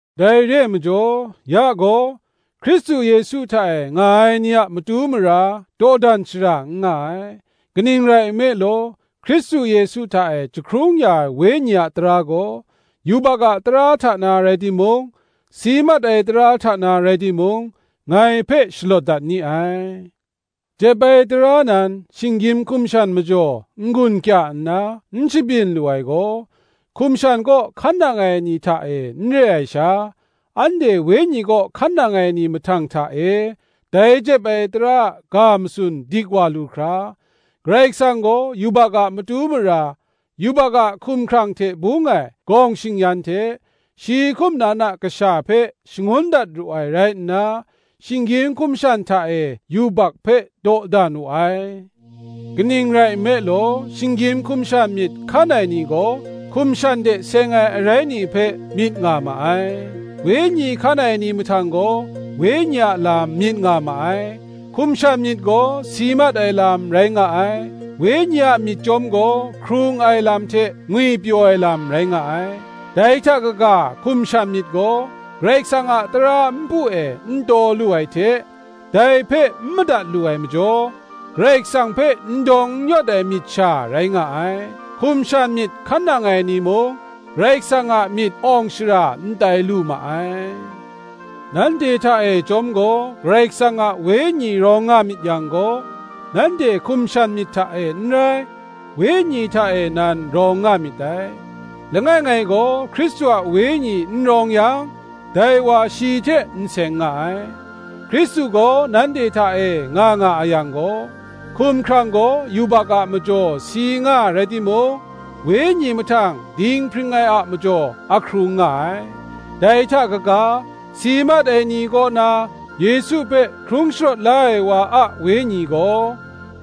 Dai re ai majaw ya gaw, Hkristu Yesu hta e nga ai ni a matu mara, dawdan shara n nga ai. Kaning rai nme law, Hkristu Yesu hta e jahkrung ya ai Wenyi a tara gaw, yubak a tara hta na rai timung, si mat ai tara hta na rai timung, ngai hpe shalawt dat ni ai. Jep ai tara nan shinggyim hkum shan majaw n-gun kya nna n shabyin lu ai gaw, hkum shan kaw hkan nang ai ni hta e n re ai sha, anhte Wenyi kaw hkan nang ai ni mahtang hta e, dai jep ai tara a ga matsun dik wa lu hkra, Karai Kasang gaw yubak a matu mara, yubak a hkumhkrang hte bung ai gawng shing-yan hte, shi hkum nan a Kasha hpe shangun dat ru ai rai nna, shinggyim hkum shan hta e yubak hpe dawdan wu ai. Kaning rai nme law, shinggyim hkum shan myit hkan ai ni gaw, hkum shan hte seng ai arai ni hpe myit nga ma ai; Wenyi hkan ai ni mahtang gaw, Wenyi a lam myit nga ma ai. Hkum shan myit gaw si mat ai lam rai nga ai; Wenyi a myit chyawm gaw, hkrung ai lam hte ngwipyaw ai lam rai nga ai. Dai hta kaga hkum shan myit gaw Karai Kasang a tara npu e n taw lu ai hte, dai hpe n madat lu ai majaw, Karai Kasang hpe n dawng n yawt ai myit sha rai nga ai; hkum shan myit hkan nang ai ni mung, Karai Kasang a myit awng shara n tai lu ma ai. Nanhte hta e chyawm gaw Karai Kasang a Wenyi rawng nga myit yang gaw, nanhte hkum shan myit hta e n rai, Wenyi hta e nan rawng nga myit dai. Langai ngai gaw Hkristu a Wenyi n rawng yang dai wa shi hte n seng nga ai. Hkristu gaw nanhte hta e nga nga a yang gaw, hkumhkrang gaw yubak a majaw si nga rai timung, wenyi mahtang dinghpring ai a majaw ahkrung nga ai. Dai hta kaga, si mat ai ni kaw na Yesu hpe hkrung sharawt la ai wa a Wenyi gaw,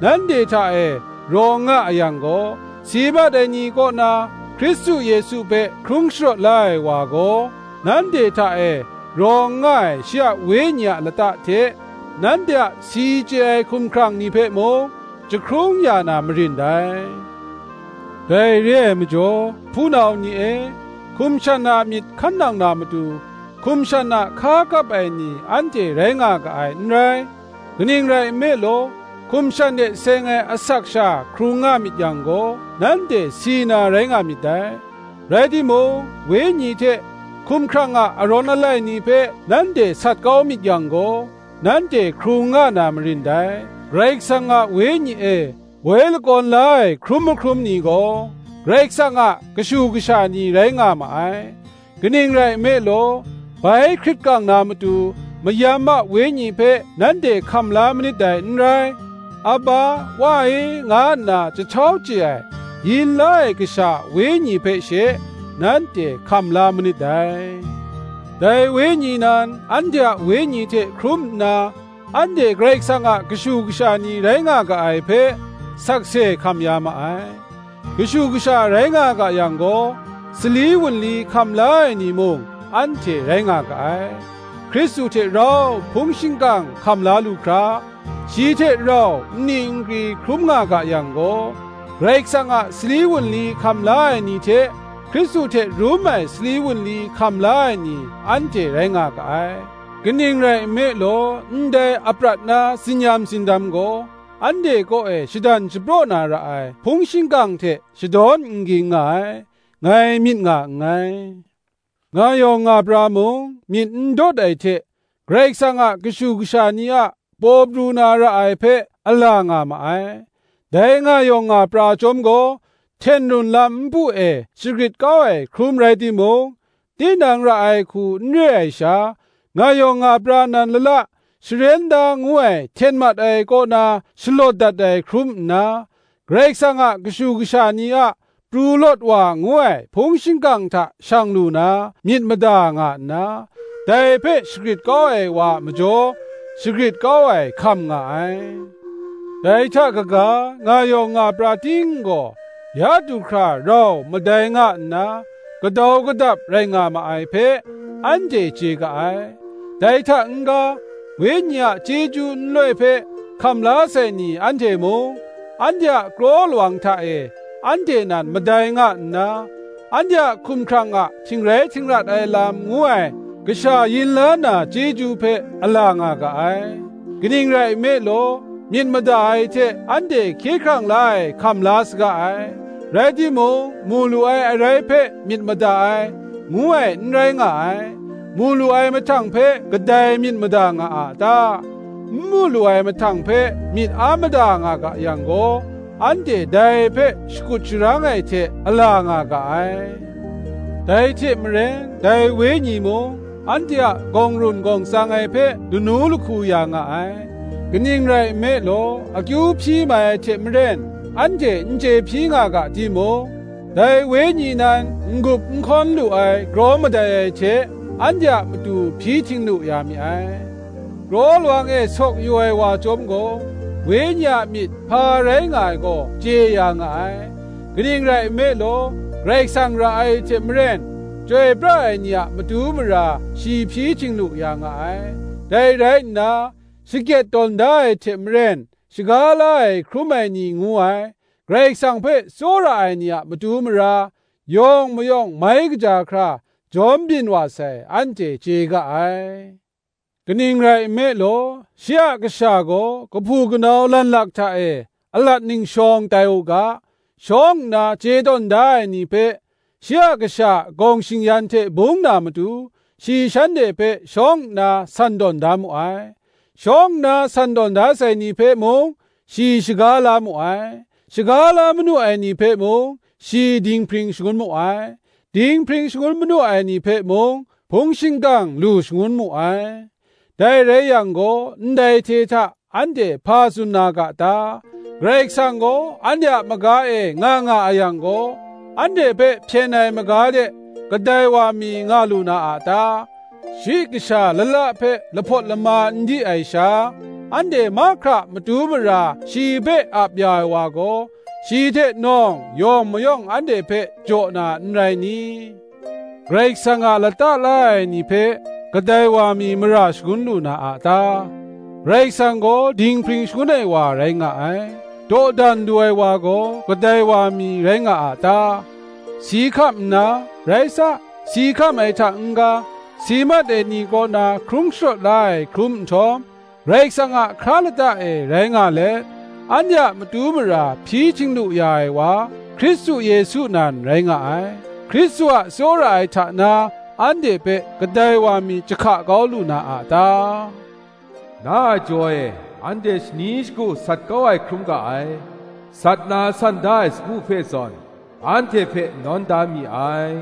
nanhte hta e rawng nga a yang gaw, si mat ai ni kaw na Hkristu Yesu hpe hkrung sharawt la ai wa gaw, nanhte hta e rawng nga ai shi a Wenyi a lata hte nanhte a si chye ai hkumhkrang ni hpe mung, jahkrung ya na marin dai. Dai re ai majaw, hpunau ni e, hkum shan a myit hkan nang na matu, hkum shan a hka kap ai ni anhte rai nga ga ai n rai; kaning rai nme law, hkum shan hte seng ai asak sha hkrung nga myit yang gaw, nanhte si na rai nga myit dai; rai timung, Wenyi hte hkumhkrang a arawn alai ni hpe nanhte sat kau myit yang gaw, nanhte hkrung nga na marin dai. Karai Kasang a Wenyi e woi lakawn la ai hkrum mahkrum ni gaw, Karai Kasang a kashu kasha ni rai nga ma ai. Kaning rai nme law, bai hkrit kang na matu, mayam a wenyi hpe nanhte hkam la manit dai n rai; Aba, Wa e, nga nna jahtau chye ai, yin la ai kasha a wenyi hpe she, nanhte hkam la manit dai. Dai Wenyi nan anhte a wenyi hte hkrum nna, anhte Karai Kasang a kashu kasha ni rai nga ga ai hpe, sakse hkam ya ma ai. Kashu kasha rai nga ga yang gaw, sali wunli hkam la ai ni mung anhte rai nga ga ai; Hkristu hte rau hpung shingkang hkam la lu hkra, shi hte rau nni nkri hkrum nga ga yang gaw, Karai Kasang a sali wunli hkam la ai ni hte, Hkristu hte rum ai sali wunli hkam la ai ni, anhte rai nga ga ai. Kaning rai nme law, ndai aprat na tsin-yam tsindam gaw, anhte kaw e shadan shapraw na ra ai hpung shingkang hte shadawn n ging nga ai, ngai myit nga nngai. Nga yawng nga pra mung myit ndawt ai hte, Karai Kasang a kashu kasha ni a paw pru na ra ai hpe ala nga ma ai. Dai nga yawng nga pra chyawm gaw, hten run lam npu e shagrit kau ai hkrum rai timung, tinang ra ai hku n re ai sha, nga yawng nga pra nan lala sharen da ngu ai hten mat ai kaw na shalawt dat ai hkrum nna, Karai Kasang a kashu kasha ni a pru lawt wa ngu ai hpung shingkang hta shang lu na, myit mada nga nna, dai hpe shagrit kau ai wa a majaw, shagrit kau ai hkam nga ai. Dai hta kaga, nga yawng nga pra ting gaw ya du hkra rau madai nga nna, gadau gadap rai nga ma ai hpe, anhte chye ga ai. Dai hta n-ga, Wenyi a chyeju nloi hpe hkam la sai ni anhte mung, anhte a kraw lawang hta e, anhte nan madai nga nna, anhte a hkumhkrang a htingrai htingrat ai lam ngu ai, kasha yin la na chyeju hpe, a la nga ga ai. Kaning rai nme law, myit mada ai hte anhte hkye hkrang la ai hkam la saga ai; rai timung, mu lu ai arai hpe myit mada ai, ngu ai n rai nga ai; mu lu ai mahtang hpe kadai myit mada nga a ta? N mu lu ai mahtang hpe myit a mada nga ga yang gaw, anhte dai hpe shakut sharang ai hte a la nga ga ai. Dai hte maren, dai Wenyi mung anhte a gawng run gawng tsang ai hpe lanu lahku ya nga ai: kaning rai nme law, akyu hpyi mai ai hte maren anhte n chye hpyi nga ga timung, dai Wenyi nan n-gup n hkawn lu ai kraw madai ai hte, anhte a matu hpyi htinglu ya mi ai; kraw lawang e sawk yu ai wa chyawm gaw, Wenyi a myit hpa rai nga ai gaw chye ya nga ai: kaning rai nme law, Karai Kasang ra ai hte maren, chyoi pra ai ni a matu mara shi hpyi htinglu ya nga ai. Dai rai nna, shakyet tawn da ai hte maren, shaga la ai hkrum ai ni ngu ai, Karai Kasang hpe tsawra ai ni a matu mara, yawng mayawng mai kaja hkra jawm byin wa sai, anhte chye ga ai. Kaning rai nme law, shi a Kasha gaw kahpu kanau lanlak hta e alat ningshawng tai u ga, shawng nna chye tawn da ai ni hpe, shi a Kasha a gawng shing-yan hte bung na matu, shi shanhte hpe shawng nna san tawn da mu ai: shawng nna san tawn da sai ni hpe mung shi shaga la mu ai; shaga la manu ai ni hpe mung, shi dinghpring shangun mu ai; dinghpring shangun manu ai ni hpe mung, hpung shingkang lu shangun mu ai. Dai rai yang gaw, ndai hte hta anhte hpa tsun na ga ta? Karai Kasang gaw anhte a maga e nga nga a yang gaw, anhte hpe hpyen ai maga de kadai wa mi nga lu na a ta? Shi kasha lala hpe lahpawt lama n di ai sha, anhte mahkra a matu mara shi hpe ap ya ai wa gaw, shi hte nawng yawng mayawng anhte hpe jaw na, n rai ni? Karai Kasang a lata la ai ni hpe kadai wa mi mara shagun lu na a ta? Karai Kasang gaw dinghpring shangun ai wa rai nga ai. Dawdan lu ai wa gaw, kadai wa mi rai nga a ta? Si hkam nna, rai sa, si hkam ai hta n-ga, si mat ai ni kaw na hkrung sharawt la ai hkrum nhtawm, Karai Kasang a hkra lata e rai nga let, anhte a matu mara hpyi htinglu ya ai wa, Hkristu Yesu nan rai nga ai. Hkristu a tsawra ai hta na anhte hpe kadai wa mi jahka kau lu na a ta? “Na a jaw e anhte shani shagu sat kau ai hkrum ga ai, Sat na san da ai sagu hpe zawn, anhte hpe nawn da mi ai,”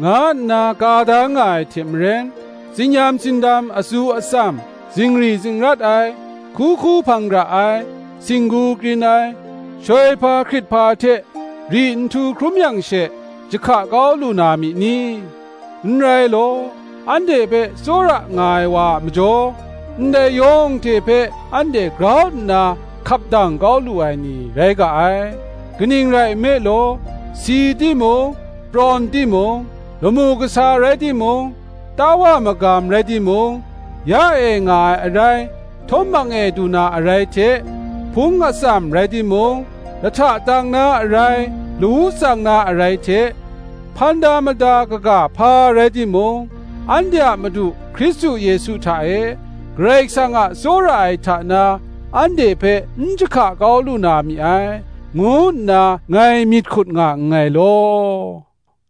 nga nna ka da nga ai hte maren, tsin-yam tsindam atsu atsam, zingri zingrat ai, hku hku hpang gara ai, singgu krin ai, shoihpa hkrithpa hte ri nhtu hkrum yang she, jahka kau lu na mi ni? N rai law, anhte hpe tsawra nga ai wa a majaw, ndai yawng hte hpe anhte grau nna hkap dang kau lu ai ni rai ga ai. Kaning rai nme law, si timung prawn timung, lamu kasa rai timung, tawa magam rai timung; ya e nga ai arai htawm hpang e du na arai hte, hpung atsam rai timung; lahta tang na arai lawu tsang na arai hte, hpan da mada kaga hpa rai timung, anhte a Madu Hkristu Yesu hta e Karai Kasang a tsawra ai hta na, anhte hpe n jahka kau lu na mi ai, ngu nna ngai myit hkut nga nngai law.